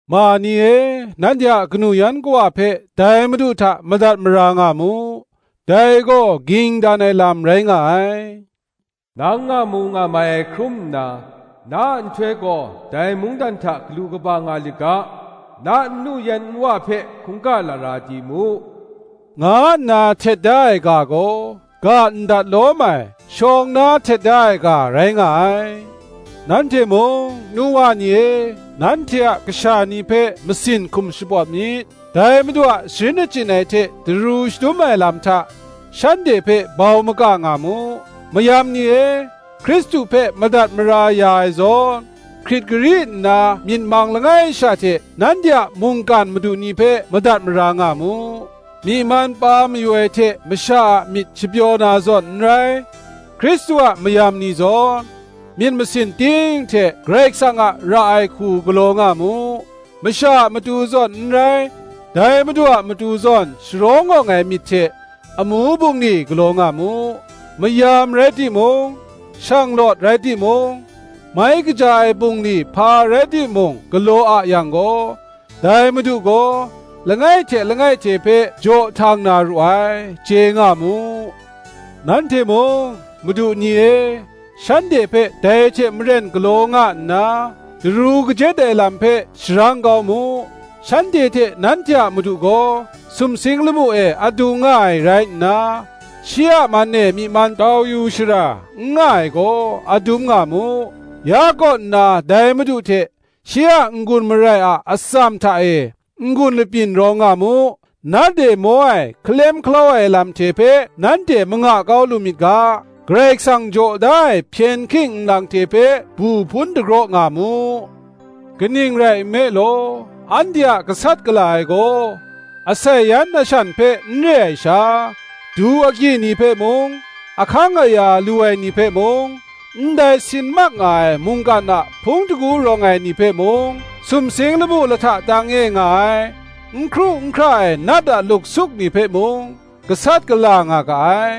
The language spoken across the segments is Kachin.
Ma ni e, nanhte a kanu yan kawa hpe dai Madu hta madat mara nga mu: dai gaw ging dan ai lam rai nga ai. Nang ngamu ngamai ai hkrum nna, na a nhtoi gaw dai mungdan hta galu kaba nga lit ga, na nnu yan nwa hpe hkungga lara di mu, nga nna htet da ai ga gaw, ga ndat lawm ai, shawng na htet da ai ga rai nga ai. Nanhte mung, nu wa ni e, nanhte a kasha ni hpe masin hkum shapawt myit: dai Madu a sharin achyin ai hte daru shadum ai lam hta, shanhte hpe bau maka nga mu. Mayam ni e, Hkristu hpe madat mara ya ai zawn, hkrit gari nna myit mang langai sha hte, nanhte a mungkan madu ni hpe madat mara nga mu. Myi man pa mayu ai hte masha a myit shapyaw na zawn n rai; Hkristu a mayam ni zawn, myit masin ting hte Karai Kasang a ra ai hku galaw nga mu: masha a matu zawn n rai, dai madu a matu zawn sharawng awng ai myit hte, amu bungli galaw nga mu. Mayam rai timung, shanglawt rai timung, mai kaja ai bungli hpa rai timung galaw a yang gaw, dai Madu gaw, langai hte langai hte hpe jaw htang na ru ai, chye nga mu. Nanhte mung, madu ni e, shanhte hpe dai hte maren galaw nga nna, daru kajet ai lam hpe sharang kau mu: shanhte hte nanhte a Madu gaw sumsing lamu e adung nga ai rai nna, shi a man e myi man tau yu shara n nga ai gaw, adum nga mu. Ya kaw nna dai Madu hte, shi a n-gun marai a atsam hta e, n-gun lapyin rawng nga mu. Nat e maw ai hkalem hkalau ai lam hte hpe nanhte manga kau lu myit ga, Karai Kasang jaw da ai hpyen hking nlang hte hpe bu hpun dagraw nga mu. Kaning rai nme law, anhte a gasat gala ai gaw, asai yan ashan hpe n re ai sha, du agyi ni hpe mung, ahkang aya lu ai ni hpe mung, ndai sin mak nga ai mungkan a hpung shingkang rawng ai ni hpe mung, sumsing lamu lahta tang e nga ai. n hkru n hkra ai nat a luksuk ni hpe mung, gasat gala nga ga ai.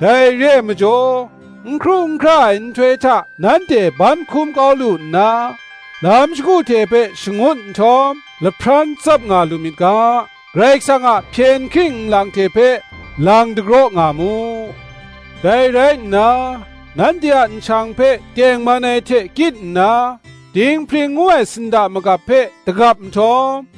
Dai re ai majaw, n hkru n hkra ai nhtoi hta nanhte ban hkum kau lu nna, lam shagu hte hpe shangut nhtawm, lahpran tsap nga lu myit ga, Karai Kasang a hpyen hking nlang hte hpe lang dagraw nga mu. Dai rai nna, nanhte a nshang hpe tengman ai hte kyit nna, dinghpring ngu ai sinda magap hpe dagap nhtawm,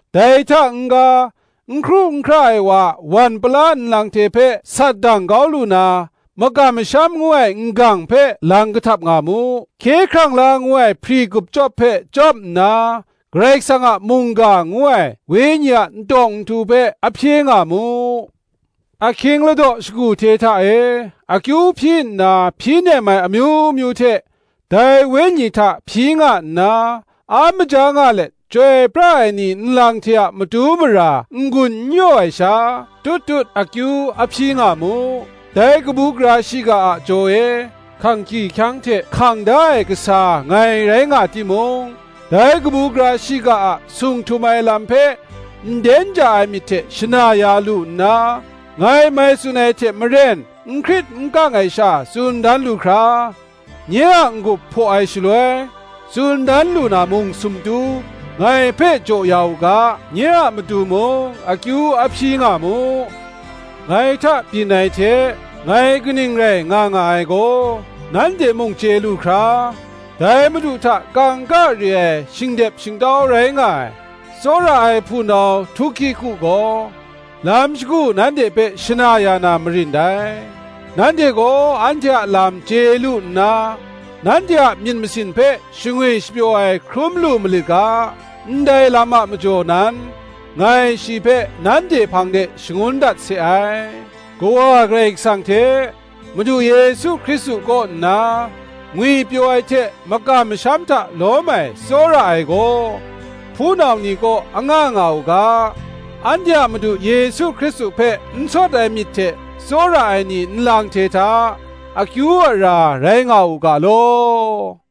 Dai hta n-ga, n hkru n hkra ai wa a wan pala nlang hte hpe sat dang kau lu na, makam masham ngu ai n-gang hpe lang kahtap nga mu. Hkye hkrang la ngu ai hpri gup chyawp hpe chyawp nna, Karai Kasang a mungga ngu ai Wenyi a ntawng nhtu hpe, a hpye nga mu. Ahkying ladaw shagu hte hta e, akyu hpyi nna hpyi nem ai amyu myu hte, dai Wenyi hta hpyi nga nna, a maja nga let chyoi pra ai ni nlang hte a matu mara n-gun n yaw ai sha, tut tut akyu a hpyi nga mu. Dai kabu gara shiga a jaw e, hkang hkyihkyang hte hkang da ai kasa ngai rai nga timung, dai kabu gara shiga a sung htum ai lam hpe nden ja ai myit hte shana ya lu nna, ngai mai tsun ai hte maren n hkrit n kang ai sha tsun dan lu hkra, nye a n-gup hpaw ai shaloi, tsun dan lu na mung sumtu, ngai hpe jaw ya u ga, nye a matu mung akyu a hpyi nga mu. Ngai hta byin ai hte, ngai kaning rai nga nga ai gaw, nanhte mung chye lu hkra, dai madu hta kangka re ai shingdep shingtau rai nga ai, tsawra ai hpunau Tuhkiku gaw, lam shagu nanhte hpe shana ya na marin dai: nanhte gaw anhte a lam chye lu nna, nanhte a myit masin hpe shangwi shapyaw ai hkrum lu malit ga, ndai lam a majaw nan, ngai shi hpe nanhte hpang de shangun dat se ai. Kawa Karai Kasang hte, Madu Yesu Hkristu kaw nna, ngwipyaw ai hte makam masham hta lawm ai tsawra ai gaw, hpunau ni kaw anga nga u ga. Anhte a Madu Yesu Hkristu hpe n sawt ai myit hte tsawra ai ni nlang hte hta, akyu ara rai nga u ga law.